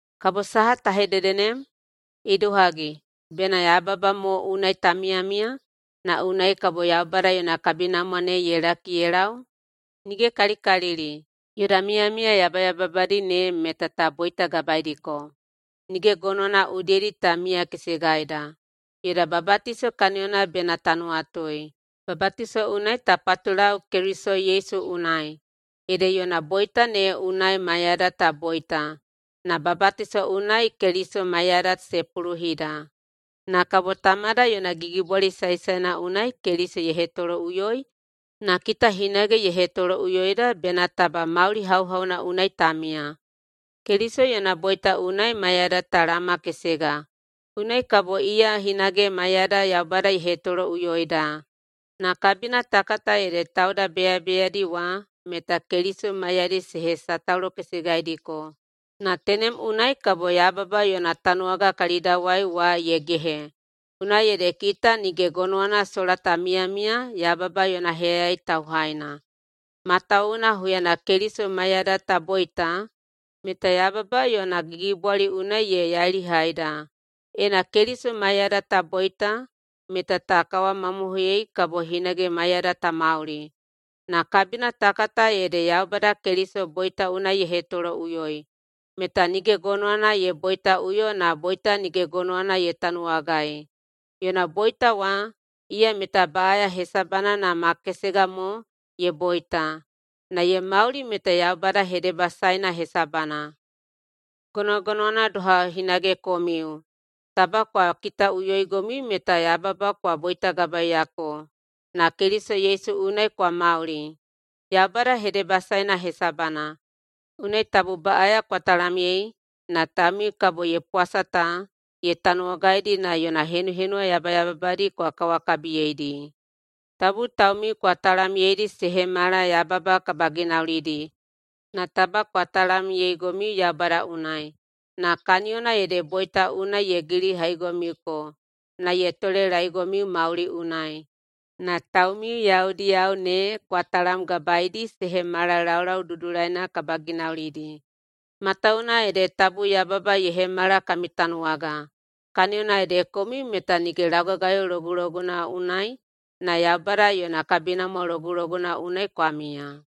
Kabo saha ta hedede nem? Idohagi, bena yababa mo unai ta miyamiya, na unai kabo Yaubada yona kabinamwa ne ye laki ye lau? Nige kalikalili! Yoda miyamiya yabayababadi ne meta ta boitagabaeidiko, nige gonowana udiyedi ta miyakesegaida. Yoda babatiso kaniyona bena ta nuwatui. Babatiso unai ta patulau Keliso Yesu unai, ede yona boita ne unai maiyada ta boita na babatiso unai Keliso maiyada se puluhida. Na kabo Tamada yona gigibwali saesaena unai Keliso ye hetoloꞌuyoi na kita hinage ye hetoloꞌuyoida bena taba mauli hauhauna unai ta miya. Keliso yona boita unai maiyada ta laomakesega. Unai kabo iya hinage maiyada Yaubada ye hetoloꞌuyoida. Na kabina ta kata ede tauda beyabeyadi wa meta Keliso maiyadi se hesataulokesegaidiko, na tenem unai kabo yababa yona tanuwaga kalidawai wa ye gehe. Unai ede kita nige gonowana sola ta miyamiya yababa yona heyayai tauhaina, matawuwuna huyana Keliso maiyada ta boita meta yababa yona gigibwali unai ye yailihaida. Ena Keliso maiyada ta boita meta ta kawamamohoiyei kabo hinage maiyada ta mauli. Na kabina ta kata ede Yaubada Keliso boita unai ye hetoloꞌuyoi, meta nige gonowana ye boitaꞌuyo na boita nige gonowana ye tanuwagai. Yona boita wa, iya meta baꞌaya hesabana na ma kesega mo ye boita. Na ye mauli meta Yaubada hedebasaeina hesabana. Gonogonowana doha hinage komiu, taba kwa kitaꞌuyoigomiu meta yababa kwa boitagabaeiyako na Keliso Yesu unai kwa mauli Yaubada hedebasaena hesabana. Unai tabu baꞌaya kwa talamyei na taumiu kabo ye pwasa ta ye tanuwagaidi na yona henuhenuwa yabayababadi kwa kawakabiyeidi. Tabu taumiu kwa talamyeidi se hemala yababa kabaginaulidi, na taba kwa talamyeigomiu Yaubada unai, na kaniyona ede boita unai ye gilihaigomiuko na ye tolelaeigomiu mauli unai. Na taumiu yaudiyao ne kwa talamgabaeidi se hemala laulau dudulaina kabaginaulidi. Matawuwuna ede tabu yababa ye hemala kami tanuwaga, kaniyona ede komiu meta nige laugagayo loguloguna unai, na Yaubada yona kabinamwa loguloguna unai kwa miya.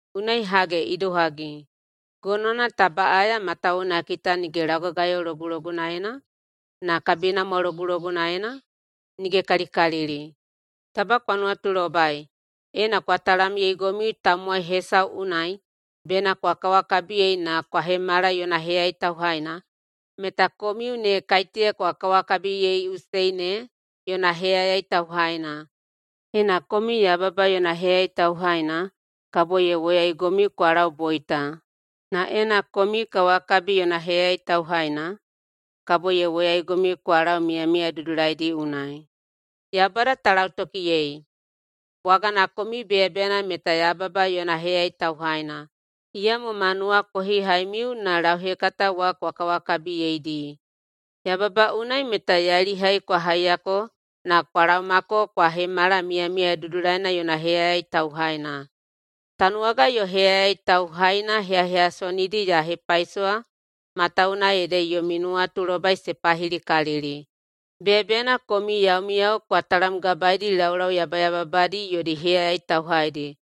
Unai hage idohagi, gonowana ta baꞌaya matawuwuna kita nige laugagayo logulogunaena, na kabinamwa logulogunaena? Nige kalikalili! Taba kwa nuwatulobai, ena kwa talamyeigomiu tamowai hesau unai bena kwa kawakabiyei na kwa hemala yona heyayai tauhaina, meta komiu ne kaiteya kwa kawakabiyeiꞌusei ne yona heyayai tauhaina. Ena komiu yababa yona heyayai tauhaina kabo ye woyaigomiu kwa lau boita, na ena komiu kawakabi yona heyayai tauhaina, kabo ye woyaigomiu kwa lau miyamiya dudulaidi unai. Yaubada ta lautokiyei! Bwagana komiu beyabeyana meta yababa yona heyayai tauhaina, iyamo ma nuwakohihaimiu na lauhekata wa kwa kawakabiyeidi. Yababa unai meta yailihai kwa haiyako na kwa laomako kwa hemala miyamiya dudulaina yona heyayai tauhaina. Tanuwaga yo heyayai tauhaina heyaheyasonidi ya hepaisowa matawuwuna ede yomi nuwatulobai se pahilikalili. Beyabeyana komiu yaumiyao kwa talamgabaeidi laulau yabayababadi yodi heyayai tauhaidi,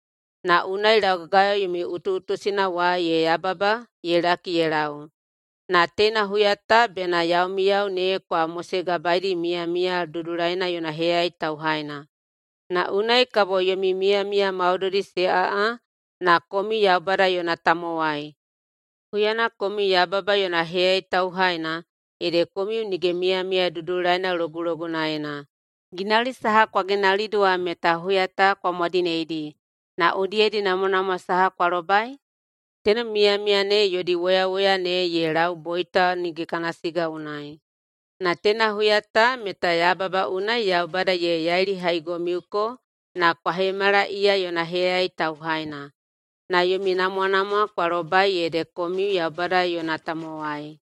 na unai laugagayo yomi utuꞌutusina wa ye yababa ye laki ye lau. Na teina huya ta bena yaumiyao ne kwa mosegabaeidi miyamiya dudulaina yona heyayai tauhaina, na unai kabo yomi miyamiya maudoidi se aꞌa na komiu Yaubada yona tamowai. Huyana komiu yababa yona heyayai tauhaina ede komiu nige miyamiya dudulaina logulogunaena. Ginauli saha kwa ginaulidi wa meta huya ta kwa mwadineidi, na udiyedi namwanamwa saha kwa lobai? Tenem miyamiya ne yodi woyawoya ne ye lau boita nige kana siga unai. Na teina huya ta meta yababa unai Yaubada ye yailihaigomiuko na kwa hemala iya yona heyayai tauhaina. Na yomi namwanamwa kwa lobai ede komiu Yaubada yona tamowai,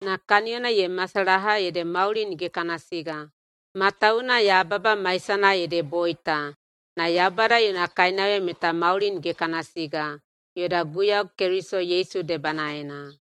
na kaniyona ye masalaha ede mauli nige kana siga. Matawuwuna yababa maisana ede boita, na Yaubada yona kainauya meta mauli nige kana siga yoda Guiyau Keliso Yesu debanaena.